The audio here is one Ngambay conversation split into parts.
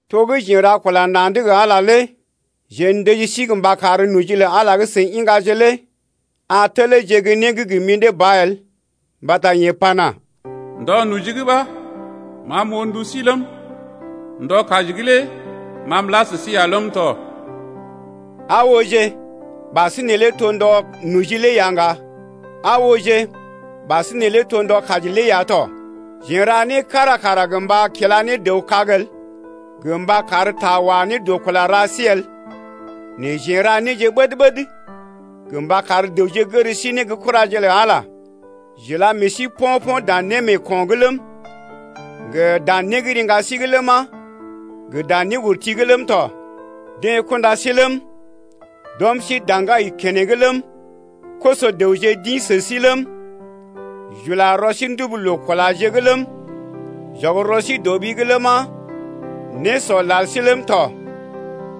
To gə́ jeḛ n’ra kula na̰’d gə Ala lé jeḛ ndəji sí mba kar noji lə Ala gə́ seḭ iŋgaje lé a teleeje gə́ né gə́ gə mḭdé ba el. Mbata yeḛ pana: Ndɔ noji’g ɓa ma m’oo ndu sí ləm, Ndɔ kaji’g lé ma m’la sə sí ya ləm tɔ. Aa ooje, ɓasinè lé to ndɔ noji lé ya ŋga. Aa ooje ɓasinè lé to ndɔ kaji lé ya tɔ. Jeḛ n’ra né kára kara gə́ mba kila ne dəw kag el gə mba kar ta wa ne dɔ kula ra sí el. Nɛ jeḛ n’ra néje ɓəd-ɓəd gə mba kar dəwje gər sí ne gə́ kuraje lə Ala. J’ila meḛ sí po̰-po̰ dan némeeko̰’g ləm, gə dan né gə́ riŋga sí’g ləma, gə dan néurti’g ləm tɔ. Deḛ kunda sí ləm, d’ɔm sí daŋgai keneŋ ləm, koso-dəwje d’ḭ sə sí ləm, j’ula rɔ sí ndubu loo-kulaje’g ləm, j’ɔg rɔ sí dɔ ɓi’g ləma, nésɔ lal sí ləm tɔ.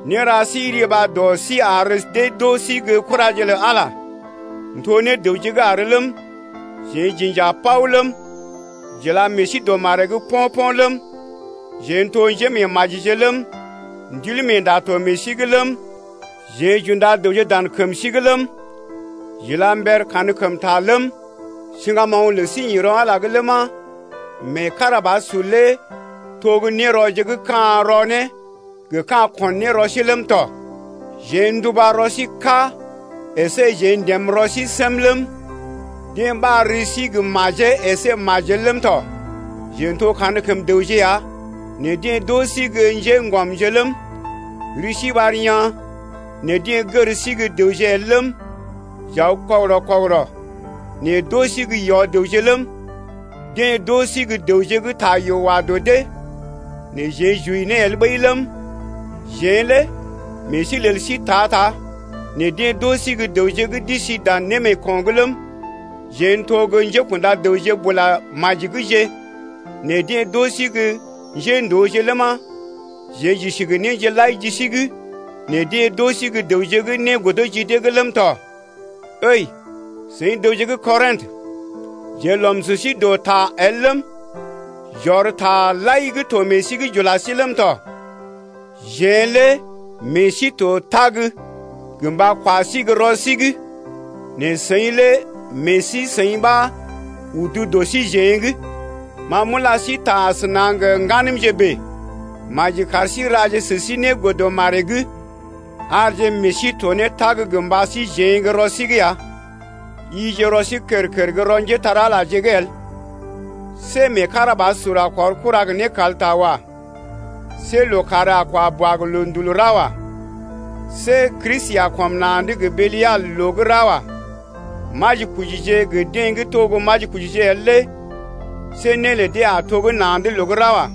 Néra sí riba dɔ sí ar dee d’oo sí gə́ kuraje lə Ala n’to ne dəwje gə́ àr ləm, jeḛ j’inja paw ləm, j’ila meḛ sí dɔ maree’g po̰-po̰ ləm, jeḛ n’to njémeemajije ləm, Ndilmeenda to meḛ sí’g ləm, jeḛ j’unda dəwje dan kəm sí’g ləm, j’ila mber kankəmta ləm, siŋgamoŋ lə sí ḭ rɔ Ala’g ləma, meekarabasur lé to gə́ nérɔje gə́ ka̰ rɔ ne, gə ka̰ ko̰ ne rɔ sí ləm tɔ. Jeḛ nduba rɔ sí kà əsé jeḛ ndəm rɔ sí səm ləm, deḛ ɓar ri sí gə́ majee əsé majel ləm tɔ. Jeḛ n’to kankəm dəwje ya nɛ deḛ d’oo sí gə́ njéŋgɔmje ləm, ri sí ɓar yaa̰ nɛ deḛ gər sí gə́ dəwje el ləm, j’aw kɔgərɔ-kɔgərɔ nɛ d’oo sí gə́ yɔ-dəwje ləm, deḛ d’oo sí gə́ dəwje gə́ ta yoo wa dɔ dee nɛ jeḛ j’wəi ne el ɓəi ləm, jeḛ lé meḛ sí lel sí ta-ta nɛ deḛ d’oo sí gə́ dəwje gə́ d’isi dan némeeko̰’g ləm, jeḛ n’to gə́ njékṵda dəwje bula maji’gje nɛ deḛ d’oo sí gə́ njéndooje ləma, jeḛ j’isi gə néje lai ji sí’g nɛ deḛ d’oo sí gə́ dəwje gə́ né godo ji dee’g ləm tɔ. Ǝi, seḭ dəwje gə́ Kɔrḭtə, jeḛ n’lɔm sə sí dɔ ta el ləm, j’ɔr taje lai gə́ to meḛ sí’g j’ula sí ləm tɔ. Jeḛ lé meḛ sí to tag gə mba kwa sí gə́ rɔ sí’g nɛ seḭ lé meḛ sí-seḭ ɓa udu dɔ síjeḛ’g. Ma m’ula sí ta asəna gə ŋganəmje bèe. Maji kar sí raje sə sí né godə maree’g arje meḛ sí to ne tag gə mba síjeḛ gə́ rɔ sí’g ya. Yije rɔ sí kər-kər gə́ rɔ njépole-magəje’g el. See meekarabasur a kɔr kura gə nékalta wa. See lookàr a kwa boa gə loondul ra wa. See Kristi a kɔm na̰’d gə Belial’g loo gə́ ra wa. Majikojije gə deḛ gə́ to gə́ majikojije el lé see né lə dee a to gə́ na̰’d loo gə́ ra wa.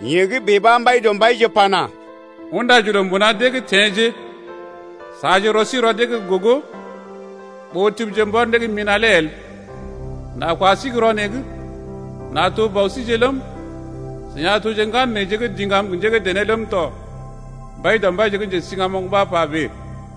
Yee gə́ bèe ɓa Mbaidɔmbaije pana: Undaje loo mbuna dee’g teḛje, Saaje rɔ sí rɔ dee’g gə́ gogo, Ɓó tibije mbɔr né gə́ mina̰ lé el. N’a kwa sí gə́ rɔ neḛ’g, n’a to bɔ síje ləm, Seḭ a toje ŋgan neḛje gə́ diŋgam gə njé gə́ dené ləm tɔ Mbaidɔmbaije gə́ njesiŋgamoŋ ɓa pa bèe.